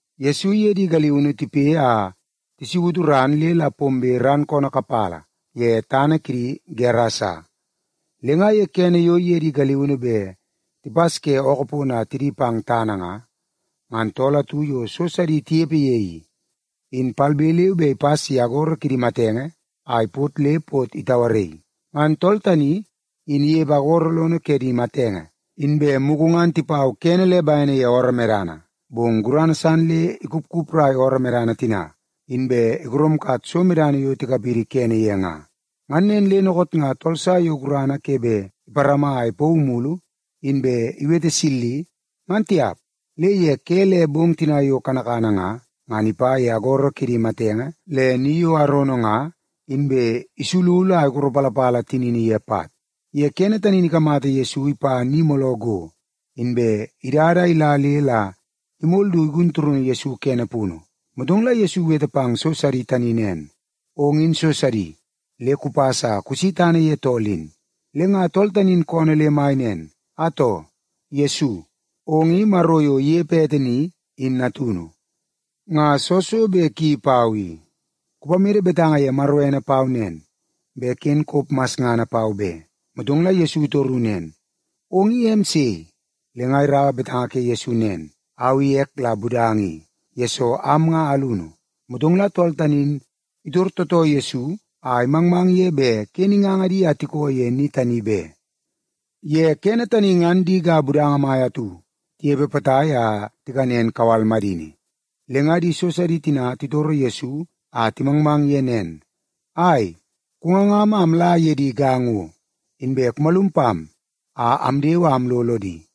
Yesu iye di galiunu tipoi a tisautu ran le la pombe ran koonoo kapala ye tana kidi tooltool ke Gerasa. Le nga ye kene yo iye di galiunu bet tipas ke ookoo pono a tidi pang tana nga, ngan tool atu yo so sidi tinepe ye i, in palbe leu be ipas ye agoro kidi matenge a ipot le pot itauaraii. Ngan tool tani in inepe agoro lono ke di matenge, inbe mugu ngan tipau kene le bene ye ooroo medana, bong gurana san le ikupkuprai ooroo medana tina, inbe igoromkat so medana yo tikapidi kene ye nga. Ngan nen le dookoot nga tool sa yo gurana ke bet iparama a ipauu mulu, ngan tiap. Le ye ke le bong tina yo kanakana nga, ngan ipa ye agoro kidi matenge le ni yo arono nga, inbe isululu a ikoropalapala tinini ye pat. Ye kene tani in ikamata Yesu ipa ni mooloo go, inbe idada a ila le la imol du igun turunu Yesu kene punu. Motong la Yesu iwete pang so sidi tani nen, “Ong in so sidi, le kupas a kusi tana ye tool in!” Le nga tool tani in koonoo le mai nen, “Atoo! Yesu, ong i Maro yo inepe ete ni, in natunu! Nga soo so bet kuyeii pau i? Kupamede betanga ye Maro ene pau nen, bet ken kop masngana pau be.” Motong la Yesu itoru nen, “Ong i em sei?” Le nga iraua betanga ke Yesu nen, “Au i ek la Budanga i, yesoo am nga alunu.” Motong la tool tani in itor tootoo Yesu a imangmang ye bet ken inganga di a tikoo ye ni tani be. Ye kene tani ngan di ga budanga mai atu tinepe potai a tikanen kawal madini. Le nga di so sidi tina titoro Yesu a timangmang ye nen, “Ai, kungangam a amla ye di ga ngo, inbe kumalum pam a amdewe a amlo lodi.”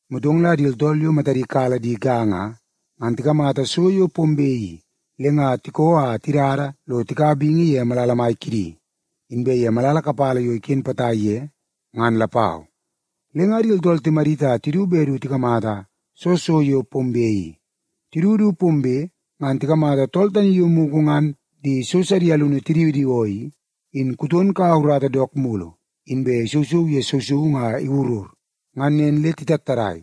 Motong la di tooltool yo matadi kala di ga nga, ngan tikamata so yo pombe i, le nga tikoo a tidada lo tikaua bingi ye malala mai kidi, inbe ye malala kapala yo iken potai ye, ngan lapau. Le nga di tooltool timadit a tidu bet du tikamata soo so yo pombe i. Tidu du pombe, ngan tikamata tool tani yo mugu ngan di so sidi alunu tidiwidiwoo i, in kuton kaua urata dook mulu, inbe isousou ye sousoungu a iwurur. Ngan nen le titattadai.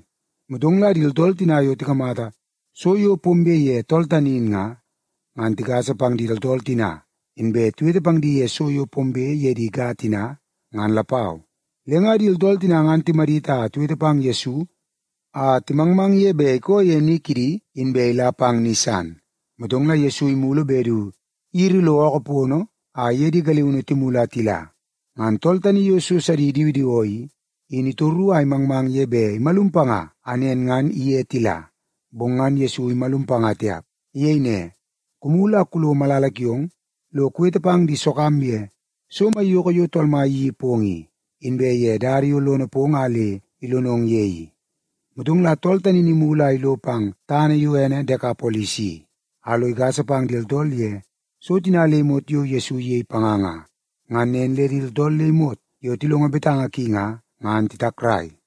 Motong la di tooltool tina yo tikamata so yo pombe ye tool tani in nga, ngan tigasa pang di tooltool tina, inbe tiwete pang di ye so yo pombe ye di ga tina, ngan lapau. Le nga di tooltool tina ngan timadit a tiwete pang Yesu a timangmang ye bet ikoo ye ni kidi inbe ila pang ni san. Motong la Yesu imulu bet du iyiri lo ookoo pono a iye di galiunu timulu a tila, ngan tool tani yo so sidi idiwidiwoo i, in itoru a imangmang ye bet imalum panga a nen ngan iye tila. Bong ngan Yesu imalum panga tiap. Iyei ne, “Kumulu a kulo malala kiong lo kuwete pang di sogam ye so maiyoko yo Tool Mai iyeii pong i, inbe ye dada yo lono pong a le ilonong ye i.” Motong la tool tani in imulu a ilo pang tana yo ene Dekapolis i, a lo igasa pang di tooltool ye so tina le imot yo Yesu iyei panga nga. Ngan nen le di tooltool le imot yo tilongo betanga ki nga, ngan titakrai.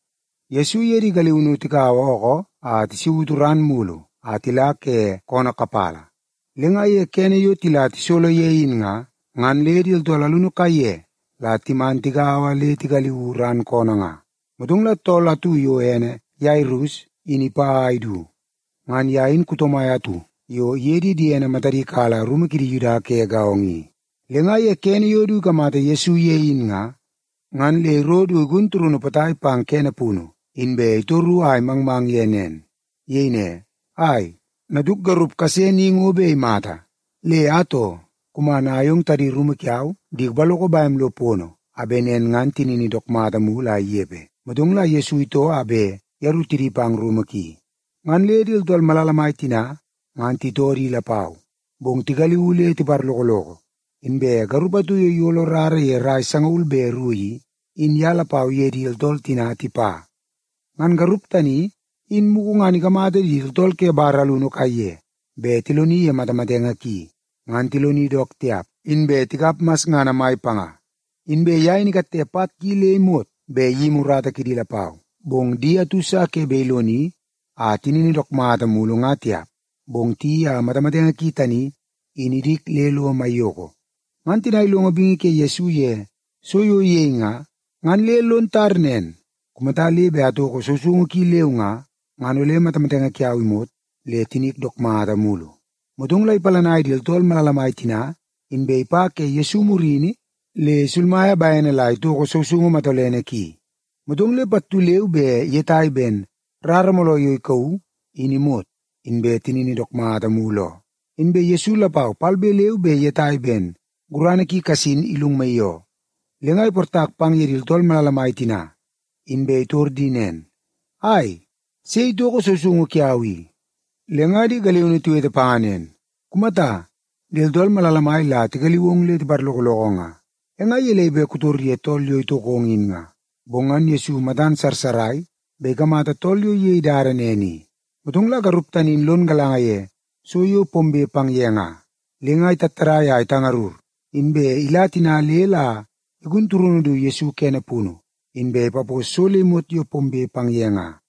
Yesu iye di galiunu tikaua ookoo a tisautu ran mulu a tila ke koonoo kapala. Le nga ye kene yo tila tisolo ye in nga, ngan le di tooltool alunu kaiye la timan tigaua le tigaliuu ran koonoo nga. Motong la tool atu yo ene Yairus in ipa a idu. Ngan ye in kuto mai atu yo iye di diene matadi kala rumu kidi Yuda ke gaongo i. Le nga ye kene yo du ikamata Yesu ye in nga, ngan le iro du igun turunu potai pang kene punu, inbe itoru a imangmang ye nen. Iyei ne, “Ai, natuk garup kase ni ngo bet imata. Le atoo, kuman a ayong tadi rumu kiau di kupaloko bem lo pono, a bet nen ngan tinini dook mata mulu a inepe.” Motong la Yesu itoo a bet yeru tidi pang rumu ki. Ngan le di tooltool malala mai tina ngan titoo di lapau, bong tigaliuu le tiparlokoloko. Inbe garup atu yo iyolo rara ye rai sangaul be ru i, in ye lapau iye di tooltool tina tipa. Ngan garup tani, in mugu ngan ikamata di tooltool ke bar alunu kaiye bet tiloni ye matamatenge ki, ngan tiloni dook tiap, inbe tikap masngana mai panga. Inbe ye in ikatte pat ki le imot bet iyimi urata kidi lapau, bong di atu sa ke bet iloni a tinini dook mata mulu nga tiap, bong tiyeii a matamatenge ki tani in idik le lo maiyoko. Ngan tina ilongo bingi ke Yesu ye so yo iyei nga, ngan le lon tar nen, “Kumata le bet atoko sousoungu ki leu nga, ngan ole matamatenge kiau imot le tinik dook mata mulu.” Motong la ipalanai di tooltool malala mai tina, inbe ipa ke Yesu murini le isulmaia bene la itoko sousoungu matolene ki. Motong le pattu leu be iyetai ben rara mooloo yo ikauu, in imot, inbe tinini dook mata mulu oo. Inbe Yesu lapau palbe leu be iyetai ben gurana ki kasin ilungmaii oo. Le nga iportak pang ye di tooltool malala mai tina, inbe itor di nen, “Ai, sei itoko sousoungu kiau i?” Le nga di galiunu tiwete panga nen, “Kumata, di tooltool malala mai la tigaliu ong le tiparlokoloko nga. E nga gelei bet kutor ye tool yo itokong in nga?” Bong ngan Yesu matan sarsarai bet ikamata tool yo iyei dada nen i. Motong la garup tani in lon galanga ye so yo pombe pang ye nga, le nga itattadai a itangarur, inbe ila tina le la igun turunu du Yesu kene punu, inbe ipapos so le imot yo pombe pang ye nga.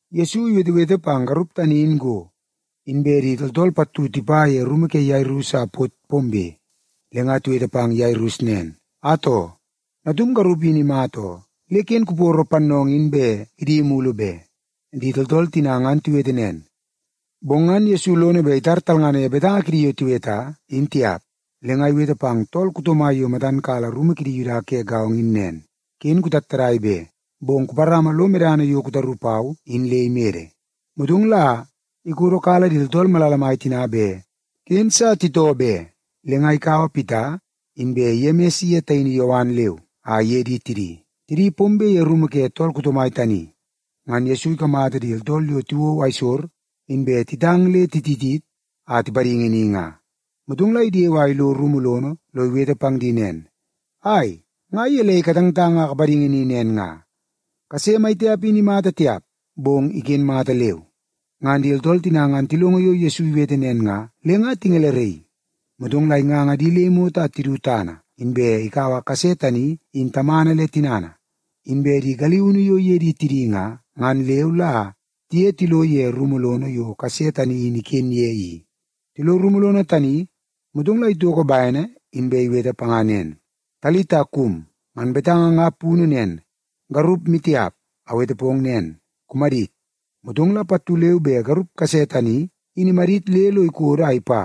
Yesu iwetewete pang garup tani in go, inbe di tooltool pattu tipa ye rumu ke Yairus a pot pombe. Le nga tiwete pang Yairus nen, “Atoo, natum garup in imata oo. Le ken kuporo pannoongoo in bet idi mulu be.” Di tooltool tina ngan tiwete nen, bong ngan Yesu lono bet itar talngana ye betanga kidi yo tiweta, in tiap. Le nga iwete pang tool kuto mai yo matan kala rumu kidi Yuda ke gaongo in nen, “Ken kutattadai be, bong kuparama lo medana yo kutaru pau in le imede.” Motong la ikodokala di tooltool malala mai tina bet ken sa titoo be. Le nga ikaua Pita inbe Yemis iye taini Yowan leu a iye di tidi. Tidi pombe ye rumu ke tool kuto mai tani, ngan Yesu ikamata di tooltool yo tiwou aisor, inbe titang le titit a tipadingi ni nga. Motong la idewe a ilo rumu lono lo iwete pang di nen, “Ai, nga gelei katangtang a kapadingi ni nen nga? Kase maitiap in imata tiap, bong iken mata leu.” Ngan di tooltool tina ngan tilongo yo Yesu iwete nen nga, le nga tingeleraii. Motong la inganga di le imot a tidu tana, inbe ikaua kase tani in tamana le tinana inbe di galiunu yo tiye di tidi nga, ngan leu la tiye tilo ye rumu lono yo kase tani in iken ye i. Tilo, motong la itoko bene inbe iwete panga nen, “Talita kum!” Ngan betanga nga punu nen, “Garup maitiap, awete pong nen, kumadit!” Motong la pattu leu be garup kase tani in imadit le lo ikodo a ipa.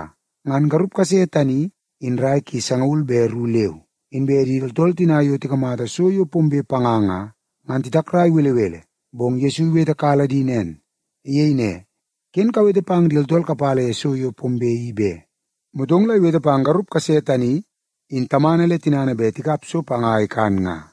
Ngan garup kase tani in rai ki sangaul be ru leu. Inbe di tooltool tina yo tikamata so yo pombe panga nga, ngan titakrai belebele. Bong Yesu iwetekala di nen. Iyei ne, “Ken kawete pang di tooltool kapala ye so yo pombe i be.” Motong la iwete pang garup kase tani in tamana le tinana bet tikap so panga a ikan nga.